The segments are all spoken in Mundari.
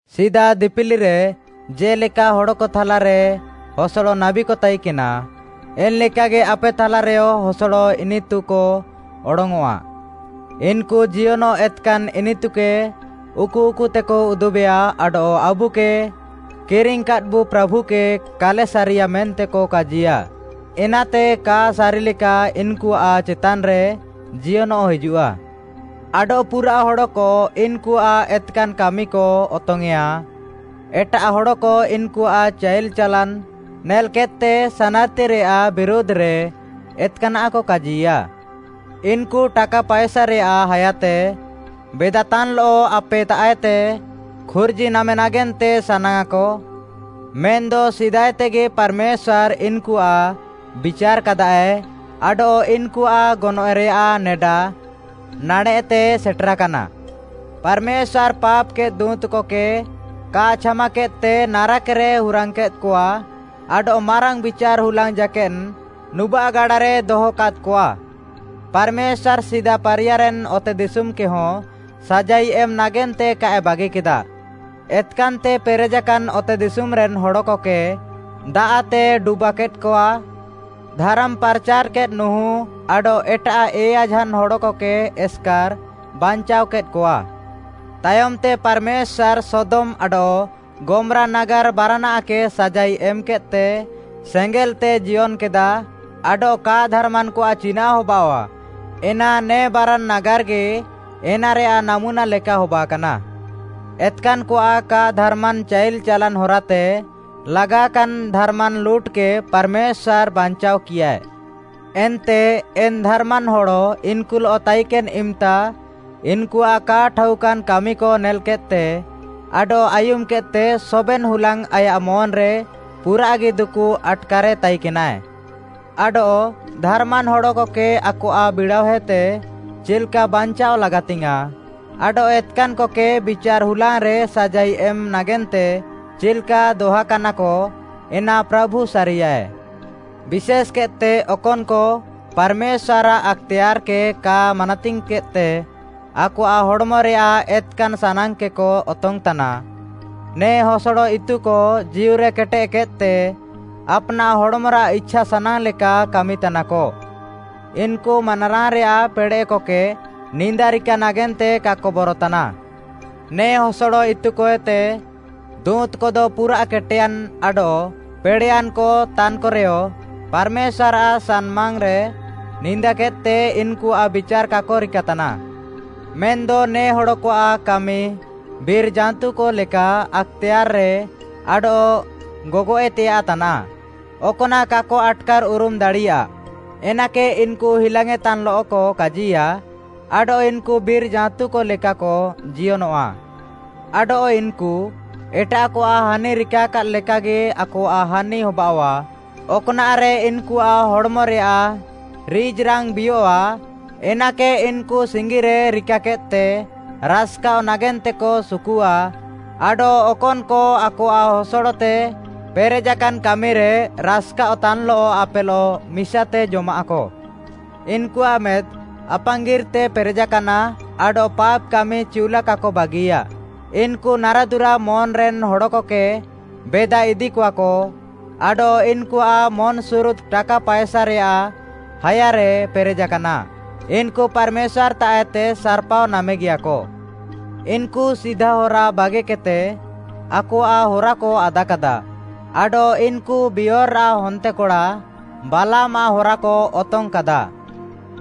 ସିଦା ଦିପିଲିରେ ଜେ'ଲେକା ହଡ଼କ ଥାଲାରେ ହସଡ଼ ନାବୀକ ତାଇକେନା, ଏନ୍‌ଲେକାଗି ଆପେ ଥାଲାରେୟ ହସଡ଼ ଇନିତୁକ ଅଡଙ୍ଗ୍‌ଅଃଆ। ଇନ୍‌କୁ ଜିୟନଃ ଏତ୍‌କାନ୍‌ ଇନିତୁକେ ଉକୁଉକୁତେକ ଉଦୁବେଆ ଆଡଃ ଆବୁକେ କିରିଙ୍ଗ୍‌କାଦ୍‌ବୁ ପ୍ରାଭୁକେ କାଲେ ସାରିୟା ମେନ୍ତେକ କାଜିୟା, ଏନାତେ କା ସାରିଲେକା ଇନ୍‌କୁଆଃ ଚେତାନ୍‌ରେ ଜିୟନଃ ହିଜୁଃଆ। ଆଡଃ ପୁରାଃ ହଡ଼କ ଇନ୍‌କୁଆଃ ଏତ୍‌କାନ୍‌ କାମିକ ଅତଙ୍ଗ୍‌ୟେଁଆ। ଏଟାଃ ହଡ଼କ ଇନ୍‌କୁଆଃ ଚାଇଲ୍‌ ଚାଲାନ୍‌ ନେଲ୍‌କେଦ୍‌ତେ ସାନାର୍‌ତିରେୟାଃ ବିରୁଧ୍‌ରେ ଏତ୍‌କାନାଃକ କାଜିୟା। ଇନ୍‌କୁ ଟାକା ପାଏସାରେୟାଃ ହାୟାତେ ବେଦାତାନ୍‌ଲଃ ଆପେତାଃଏତେ ଖୁର୍ଜି ନାମେ ନାଗେନ୍ତେକ ସାନାଙ୍ଗ୍‌ଆଃ, ମେନ୍‌ଦ ସିଦାଏତେଗି ପାର୍‌ମେଶ୍ୱାର୍‌ ଇନ୍‌କୁଆଃ ବିଚାର୍‌କାଦାଏ ଆଡଃ ଇନ୍‌କୁଆଃ ଗନଏଃରେୟାଃ ନେଡା ନାଡ଼େଃତେ ସେଟେରାକାନା। ପାର୍‌ମେଶ୍ୱାର୍‌ ପାପ୍‌କେଦ୍‌ ଦୁଁତ୍‌କକେ କା ଛାମାକେଦ୍‌ତେ ନାରାକ୍‌ରେ ହୁରାଙ୍ଗ୍‌କେଦ୍‌କଆ ଆଡଃ ମାରାଙ୍ଗ୍‌ ବିଚାର୍‌ ହୁଲାଙ୍ଗ୍‌ ଜାକେଦ୍‌ ନୁବାଃ ଗାଡ଼ାରେ ଦହକାଦ୍‌କଆ। ପାର୍‌ମେଶ୍ୱାର୍‌ ସିଦା ପାରିୟାରେନ୍‌ ଅତେଦିଶୁମ୍‌କେହଁ ସାଜାଇ ଏମ୍‌ ନାଗେନ୍ତେ କାଏ ବାଗିକେଦା, ଏତ୍‌କାନ୍‌ତେ ପେରେଜାକାନ୍‌ ଅତେଦିଶୁମ୍‌ରେନ୍‌ ହଡ଼କକେ ଦାଆଃତେ ଡୁବାକେଦ୍‌କଆ। ଧାରାମ୍‌ ପାର୍‌ଚାର୍‌କେଦ୍‌ ନୁହୁଁ ଆଡଃ ଏଟାଃ ଏୟା ଝାନ୍‌ ହଡ଼କକେ ଏସ୍‌କାର୍‌ ବାଚାଅକେଦ୍‌କଆ। ତାୟମ୍‌ତେ ପାର୍‌ମେଶ୍ୱାର୍‌ ସୋଦମ୍‌ ଆଡଃ ଗମ୍‌ରା ନାଗାର୍‌ ବାରାନାଃକେ ସାଜାଇ ଏମ୍‌କେଦ୍‌ତେ ସେଙ୍ଗେଲ୍‌ତେ ଜିୟନ୍‌କେଦା ଆଡଃ କା ଧାର୍‌ମାନ୍‌କଆଃ ଚିନାଃ ହବାଅଃଆ, ଏନା ନେ ବାରାନ୍‌ ନାଗାର୍‌ଗି ଏନାରେୟାଃ ନାମୁନା ଲେକା ହବାକାନା। ଏତ୍‌କାନ୍‌କଆଃ କା ଧାର୍‌ମାନ୍‌ ଚାଇଲ୍‌ ଚାଲାନ୍‌ ହରାତେ ଲାଗାକାନ୍‌ ଧାର୍‌ମାନ୍‌ ଲୁଟ୍‌କେ ପାର୍‌ମେଶ୍ୱାର୍‌ ବାଞ୍ଚାଅକିୟାଏ। ଏନ୍ତେ ଏନ୍‌ ଧାର୍‌ମାନ୍‌ ହଡ଼ ଇନ୍‌କୁଲଃ ତାଇକେନ୍‌ ଇମ୍‌ତା ଇନ୍‌କୁଆଃ କା ଠାଉକାନ୍‌ କାମିକ ନେଲ୍‌କେଦ୍‌ତେ ଆଡଃ ଆୟୁମ୍‌କେଦ୍‌ତେ ସବେନ୍‌ ହୁଲାଙ୍ଗ୍‌ ଆୟାଃ ମନ୍‌ରେ ପୁରାଃଗି ଦୁକୁ ଆଟ୍‌କାରେ ତାଇକେନାଏ। ଆଡଃ ଧାର୍‌ମାନ୍‌ ହଡ଼କକେ ଆକଆଃ ବିଡ଼ାଅହେତେ ଚିଲ୍‌କା ବାଞ୍ଚାଅ ଲାଗାତିଙ୍ଗ୍‌ୟାଁଃ, ଆଡଃ ଏତ୍‌କାନ୍‌କକେ ବିଚାର୍‌ ହୁଲାଙ୍ଗ୍‌ରେ ସାଜାଇ ଏମ୍‌ ନାଗେନ୍ତେ ଚିଲ୍‌କା ଦହାକାନାକ, ଏନା ପ୍ରାଭୁ ସାରିୟାଏ। ବିଶେଷ୍‌କେଦ୍‌ତେ ଅକନ୍‌କ ପାର୍‌ମେଶ୍ୱାର୍‌ଆଃ ଆକ୍‌ତେୟାର୍‌କେ କା ମାନାତିଙ୍ଗ୍‌କେଦ୍‌ତେ ଆକଆଃ ହଡ଼୍‌ମରେୟାଃ ଏତ୍‌କାନ୍‌ ସାନାଙ୍ଗ୍‌କେକ ଅତଙ୍ଗ୍‌ତାନା। ନେ ହସଡ଼ ଇତୁକ ଜୀଉରେ କେଟେଦ୍‌କେଦ୍‌ତେ, ଆପ୍‌ନାଃ ହଡ଼୍‌ମରାଃ ଇଛା ସାନାଙ୍ଗ୍‌ ଲେକା କାମିତାନାକ। ଇନ୍‌କୁ ମାନାରାଙ୍ଗ୍‌ରେୟାଃ ପେଡ଼େଃକକେ ନିନ୍ଦା ରିକା ନାଗେନ୍ତେ କାକ ବରତାନା। ନେ ହସଡ଼ ଇତୁକଏତେ ଦୁଁତ୍‌କଦ ପୁରାଃ କେଟେୟାନ୍‌ ଆଡଃ ପେଡ଼େୟାନ୍‌କ ତାନ୍‌କରେୟ ପାର୍‌ମେଶ୍ୱାର୍‌ଆଃ ସାମ୍‌ନାଙ୍ଗ୍‌ରେ ନିନ୍ଦାକେଦ୍‌ତେ ଇନ୍‌କୁଆଃ ବିଚାର୍‌ କାକ ରିକା ତାନା। ମେନ୍‌ଦ ନେ ହଡ଼କଆଃ କାମି ବିର୍‌ ଜାଁତୁକ ଲେକା ଆକ୍‌ତେୟାର୍‌ରେ ଆଡଃ ଗଗଏଃତେୟାଃ ତାନା, ଅକ୍‌ନାଃ କାକ ଆଟ୍‌କାର୍‌ଉରୁମ୍‌ ଦାଡ଼ିୟା, ଏନାକେ ଇନ୍‌କୁ ହିଲାଙ୍ଗ୍‌ୟେଁତାନ୍‌ଲଃକ କାଜିୟା, ଆଡଃ ଇନ୍‌କୁ ବିର୍‌ ଜାଁତୁ ଲେକାକ ଜିୟନଃଆ, ଆଡଃ ଇନ୍‌କୁ ଏଟାଃକଆଃ ହାନି ରିକାକାଦ୍‌ ଲେକାଗି ଆକଆଃ ହାନି ହବାଅଃଆ। ଅକ୍‌ନାଃରେ ଇନ୍‌କୁଆଃ ହଡ଼୍‌ମରେୟାଃ ରିଜ୍‌ରାଙ୍ଗ୍‌ ବିୟଃଆ, ଏନାକେ ଇନ୍‌କୁ ସିଙ୍ଗିରେ ରିକାକେଦ୍‌ତେ ରାସ୍‌କାଃଅ ନାଗେନ୍ତେକ ସୁକୁଃଆ, ଆଡଃ ଅକନ୍‌କ ଆକଆଃ ହସଡ଼ତେ ପେରେଜାକାନ୍‌ କାମିରେ ରାସ୍‌କାଅଃତାନ୍‌ଲଃ ଆପେଲଃ ମିସାତେ ଜମାଃକ। ଇନ୍‌କୁଆଃ ମେଦ୍‌ ଆପାଙ୍ଗିର୍‌ତେ ପେରେଜାକାନା ଆଡଃ ପାପ୍‌କାମି ଚିଉଲା କାକ ବାଗିୟା। ଇନ୍‌କୁ ନାରାଦୁରା ମନ୍‌ରେନ୍‌ ହଡ଼କକେ ବେଦା ଇଦିକଆକ, ଆଡଃ ଇନ୍‌କୁଆଃ ମନ୍‌ସୁରୁଦ୍‌ ଟାକା ପାଏସାରେଆଃ ହାୟାରେ ପେରେଜାକାନା। ଇନ୍‌କୁ ପାର୍‌ମେଶ୍ୱାର୍‌ତାଃଏତେ ସାର୍‌ପାଅ ନାମେଗିୟାକ। ଇନ୍‌କୁ ସିଧା ହରା ବାଗିକେଦ୍‌ତେ ଆକଆଃ ହରାକ ଆଦାକାଦା, ଆଡଃ ଇନ୍‌କୁ ବିୟୋର୍‌ରାଃ ହନ୍ତେକଡ଼ା ବାଲାମ୍‌ଆଃ ହରାକ ଅତଙ୍ଗ୍‌କାଦା।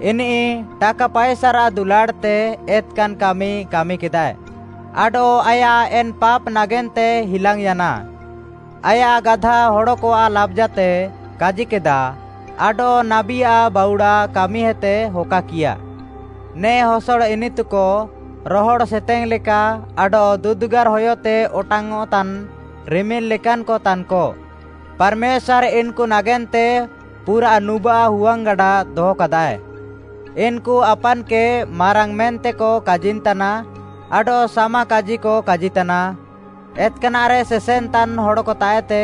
ଇନିଃ ଟାକା ପାଏସାରାଃ ଦୁଲାଡ଼୍‌ତେ ଏତ୍‌କାନ୍‌ କାମି କାମିକେଦାଏ, ଆଡଃ ଆୟାଃ ଏନ୍‌ ପାପ୍‌ ନାଗେନ୍ତେ ହିଲାଙ୍ଗ୍‌ୟାନା। ଆୟାଃ ଗାଧା ହଡ଼କଆଃ ଲାବ୍‌ଜାତେ କାଜିକେଦା, ଆଡଃ ନାବୀଆଃ ବାଉଡ଼ା କାମିହେତେ ହକାକିୟା। ନେ ହସଡ଼ ଇନିତୁକ ରହଡ଼୍‌ ସେତେଙ୍ଗ୍‌ ଲେକା ଆଡଃ ଦୁଦ୍‌ଗାର୍‌ ହୟତେ ଅଟାଙ୍ଗ୍‌ଅଃତାନ୍‌ ରିମିଲ୍‌ ଲେକାନ୍‌କ ତାନ୍‌କ। ପାର୍‌ମେଶ୍ୱାର୍‌ ଇନ୍‌କୁ ନାଗେନ୍ତେ ପୁରାଃ ନୁବାଃ ହୁଆଙ୍ଗ୍‌ଗାଡ଼ା ଦହକାଦାଏ। ଇନ୍‌କୁ ଆପାନ୍‌କେ ମାରାଙ୍ଗ୍‌ ମେନ୍ତେକ କାଜିନ୍‌ତାନା ଆଡଃ ସାମାକାଜିକ କାଜିତାନା, ଏତ୍‌କାନାଃରେ ସେସେନ୍‌ତାନ୍‌ ହଡ଼କତାଃଏତେ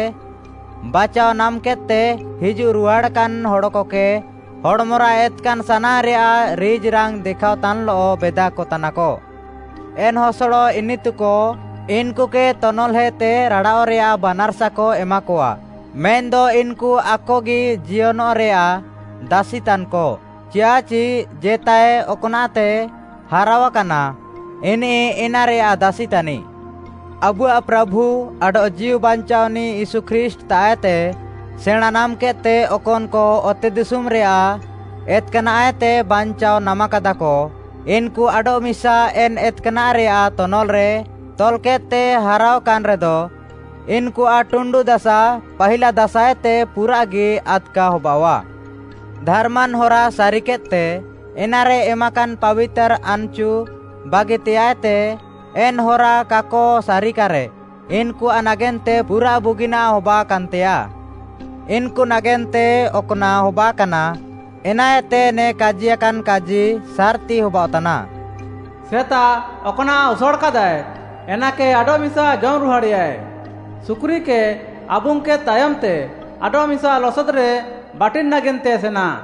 ବାଚାଅ ନାମ୍‌କେଦ୍‌ତେ ହିଜୁଃ ରୁହାଡ଼ାକାନ୍‌ ହଡ଼କକେ ହଡ଼୍‌ମରାଃ ଏତ୍‌କାନ୍‌ ସାନାଙ୍ଗ୍‌ରେୟାଃ ରିଜ୍‌ରାଙ୍ଗ୍‌ ଦେଖାଅତାନ୍‌ଲଃ ବେଦାକତାନାକ। ଏନ୍‌ ହସଡ଼ ଇନିତୁକ ଇନ୍‌କୁକେ ତନଲ୍‌ହେତେ ରାଡ଼ାଅଃରେୟାଃ ବାନାର୍‌ସାକ ଏମାକଆ, ମେନ୍‌ଦ ଇନ୍‌କୁ ଆକଗି ଜିୟନଃରେୟାଃ ଦାସିତାନ୍‌କ, ଚିୟାଃଚି ଜେତାଏ ଅକ୍‌ନାଃତେ ହାରାଅକାନା, ଇନିଃ ଏନାରେୟାଃ ଦାସି ତାନିଃ। ଆବୁଆଃ ପ୍ରାଭୁ ଆଡଃ ଜୀଉବାଞ୍ଚାଅନିଃ ୟୀଶୁ ଖ୍ରୀଷ୍ଟ୍‌ତାଃଏତେ ସେଣାଁଁ ନାମ୍‌କେଦ୍‌ତେ ଅକନ୍‌କ ଅତେଦିଶୁମ୍‌ରେୟାଃ ଏତ୍‌କାନାଃଏତେ ବାଞ୍ଚାଅ ନାମାକାଦାକ, ଇନ୍‌କୁ ଆଡଃମିସା ଏନ୍‌ ଏତ୍‌କାନାଃରେୟାଃ ତନଲ୍‌ରେ ତଲ୍‌କେଦ୍‌ତେ ହାରାଅ କାନ୍‌ରେଦ, ଇନ୍‌କୁଆଃ ଟୁଣ୍ଡୁ ଦାସା, ପାହିଲା ଦାସାଏତେ ପୁରାଃଗି ଆଦ୍‌କା ହବାଅଃଆ। ଧାର୍‌ମାନ୍‌ ହରା ସାରିକେଦ୍‌ତେ, ଏନାରେ ଏମାକାନ୍‌ ପାବିତାର୍‌ ଆନ୍‌ଚୁ ବାଗିତେୟାଃଏତେ, ଏନ୍‌ ହରା କାକ ସାରିକାରେ ଇନ୍‌କୁଆଃ ନାଗେନ୍ତେ ପୁରାଃ ବୁଗିନାଃ ହବାକାନ୍‌ତେୟାଃ। ଇନ୍‌କୁ ନାଗେନ୍ତେ ଅକ୍‌ନାଃ ହବାକାନା, ଏନାଏତେ ନେ କାଜିୟାକାନ୍‌ କାଜି ସାର୍‌ତି ହବାଅଃତାନା, “‘ସେତା ଅକ୍‌ନାଃ ଉସାଡ଼୍‌କାଦାଏ, ଏନାକେ ଆଡଃମିସା ଜମ୍‌ ରୁହାଡ଼େଆଏ,’ ‘ସୁକୁରିକେ ଆବୁଙ୍ଗ୍‌କେଦ୍‌ ତାୟମ୍‌ତେ ଆଡଃମିସା ଲସଦ୍‌ରେ ବାଟିନ୍‌ ନାଗେନ୍ତେ ସେନା।’”